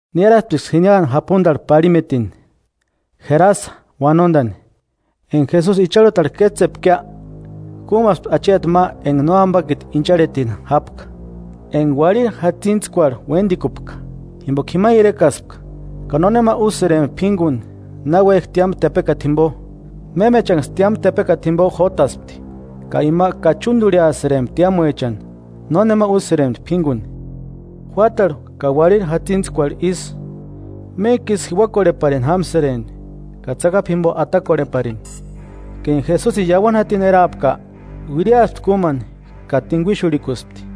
Niárasptiksï jiniani japundarhu parhimetini, Jerasa uanondani. Enga Jesusi icharhutarhu kétsepkia, kúmaspti acheti ma enga nóambakiti incharhetini jápka, enga uarhiri jatsintskuarhu uéndikupka, jimboka jima irekaspka. Ka nónema úsïrempti p'ínguni, náuejki tiámu tepekata jimbo. Mémechaniksï tiámu tepekata jimbo jótaspti, ka ima kachundurhiasïrempti tiámuechani, nónema úsïrempti p'ínguni. Juátarhu ka uarhiri jatsintskuarhu isï, méntkisï jiuakorheparini jámsïrempti ka tsakapu jimbo atakorheparini. Ka enga Jesusini iauani jatini erapka, uiriaspti kúmani ka tinguixurhikuspti,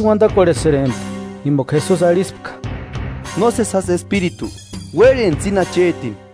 Ísï uandakorhesïrempti jimboka Jesusi arhispka: –¡Nósesi jásï espiritu, uérhentsï íni achetini!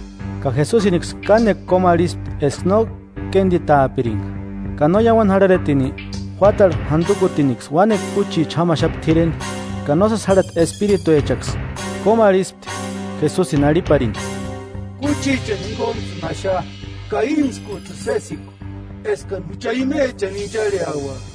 Ka Jesusiniksï kánekua kómu arhispti eska no kénditaapiringa. Ka no iauani jarharetini, juátarhu jandukutiniksï uánekua kúchicha jámaxapti t'ireni, ka nósesi jarhati espirituechaksï kómu arhispti Jesusini arhiparini: –Kúchiachani jinguntsïni axa ka íntskujtsïni sésekua eskani jucha imechani incharheauaka.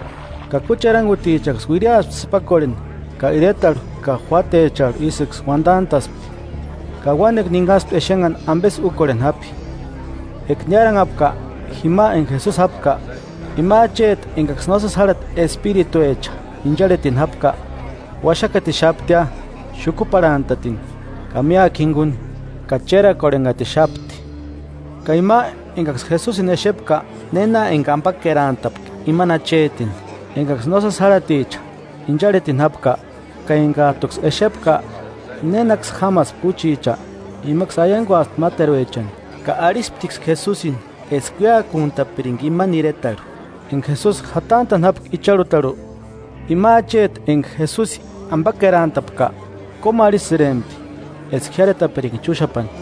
Ka kúchi erangutichaksï uiriaspti sïpakorheni ka iretarhu ka juátecharhu isïksï uandantaspti. Ka uánekua ninhaspti exenhani ambesï úkorheni japi. Eka niáranhapka jima enga Jesusi jápka, ima acheti engaksï nósesi járhati espirituecha incharhetini jápka, uaxakatixaptia xukuparhantatini ka míakua jinguni. Ka chérakorhenhatixapti. Ka ima engaksï Jesusini exepka, néna enga ambakerantapka imani achetini, engaksï nósesi járhaticha incharhetini jápka, ka engajtuksï exepka nénaksï jámaspki kúchicha, imaksï aianguaspti máteruechani. Ka arhisptiksï Jesusini eska uéakuntapiringa imani iretarhu. Enga Jesusi jatantani jápka icharhutarhu, ima acheti enga Jesusi ambakerantapka, kómu arhisïrempti eska jiáretapiringa chúxapani.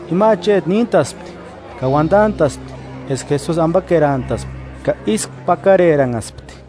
Ima acheti níntaspti, ka uandantaspti eska Jesusi ambakerantaspka; ka ísku pakareranhaspti.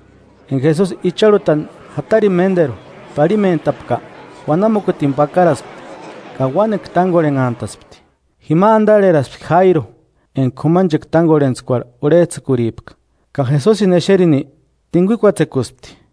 Enga Jesusi icharhutani jatarini ménderu parhimentapka, uanamukutini pakaraspti ka uánekua tángorhenhantaspti. Jima andarheraspti Jáiru, enga k'umanchekua tángorhentskuarhu urhejtsïkuripka, ka Jesusini exerini, tinguikuatsekuspti.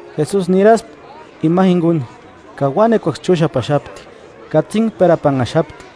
Jesusi niraspti ima jinguni, ka uánekuaksï chúxapaxapti, katsinhperapanhaxapti.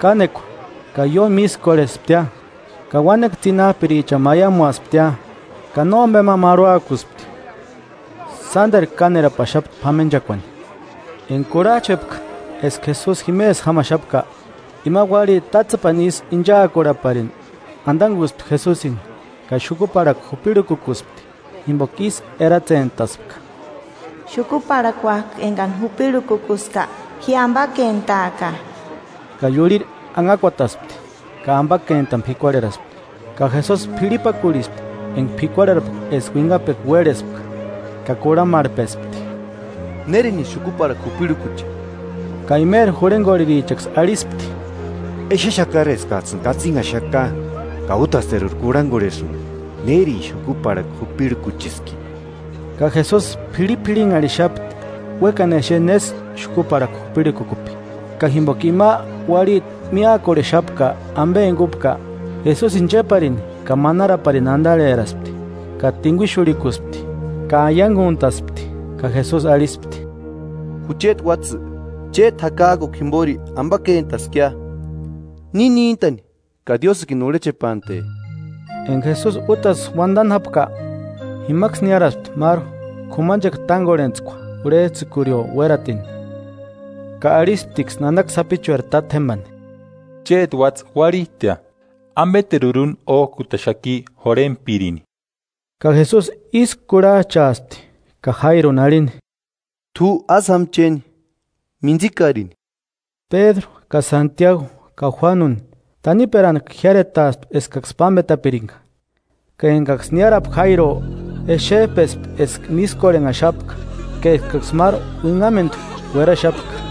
Kánekua ka ióni mískorhesptia, ka uánekua tsinajpirichani maiamuasptia, ka nómbema marhuakuspti, sánderu kánerapaxapti p'amenchakuani. Enga kurhajchpepka eska Jesusi jimesï jámaxapka, ima uarhiti tátsepani isï inchaakurhaparini andanguspti Jesusini, ka xukuparhakua jupirhukukuspti. Jimboka ísï eratsentaspka: “Xukuparhakuajkuni engani jupirhukukuska, ji ambakentaaka.” Ka iurhiri anhakuataspti, ka ambakentani p'ikuarheraspti. Ka Jesusi p'irhipakurhispti enga p'ikuarherapka eska uinhapekua uérhespka, ka kurhamarhpespti: –¿Nérinisï xukuparhakua jupirhukuche? Ka imeri jurhengorherichaksï arhispti: –Exexakari eskajtsïni katsinhaxaka, ka útasteruri kurhangorhesïnga, ¿Nérini xukuparhakua jupirhukucheski? Ka Jesusi p'irhip'irhinharhixapti, uékani exeni nésï xukuparhakua jupirhukukupki. Ka jimboka ima uarhiti míakorhexapka ambe enga úpka, Jesusini chéparini ka manaraparini andarheraspti ka tinguixurhikuspti, ka aianguntaspti. Ka Jesusi arhispti: –Jucheti uátsï, chéti jakajkukua jimbori ambakentaskia, ni níntani ka Diósïkini urhechepante. Enga Jesusi útasï uandani jápka, jimaksï niáraspti máru k'umanchekua tángorhentskua urhejtsïkurio uératini, ka arhisptiksï nanaka sapichueri tátjembani: –Chéti uátsï uarhistia, ¿Ambeteruri úni ójkutaxaki jurhentpirini? Ka Jesusi ísku kurhajchaaspti ka Jáiruni arhini: –T'u ásï jáma chéni, mintsikarini. Pédru ka Santiagu ka Juánuni, taniperantku jiáretaaspti eskaksï pámbetapiringa. Ka engaksï niárapka Jáiruo, exejpespti eska mískorhenhaxapka, ka eskaksï máru uinhamendu ueraxapka,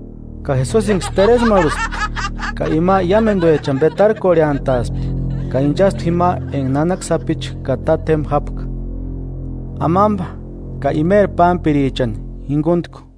Ka Jesusiniksï teresmarhuspti, ka ima iámenduechani petarkorheantaspti, ka inchaspti jima enga nanaka sapichu ka tátjemba jápka, amamba ka imeri pámpirichani jinguntku.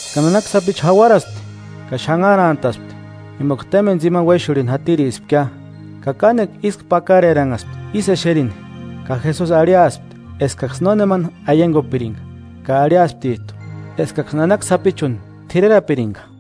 Ka nanaka sapichu jauarapaspti ka xanharantaspti, jimboka témbeni tsimani uéxurhini jatirispkia. Ka kánekua ísku pakareranhaspti ísï exerini. Ka Jesusi arhiaspti eskaksï nónemani aiangupiringa ka arhiasptijtu eskaksï nanaka sapichuni t'irerapiringa.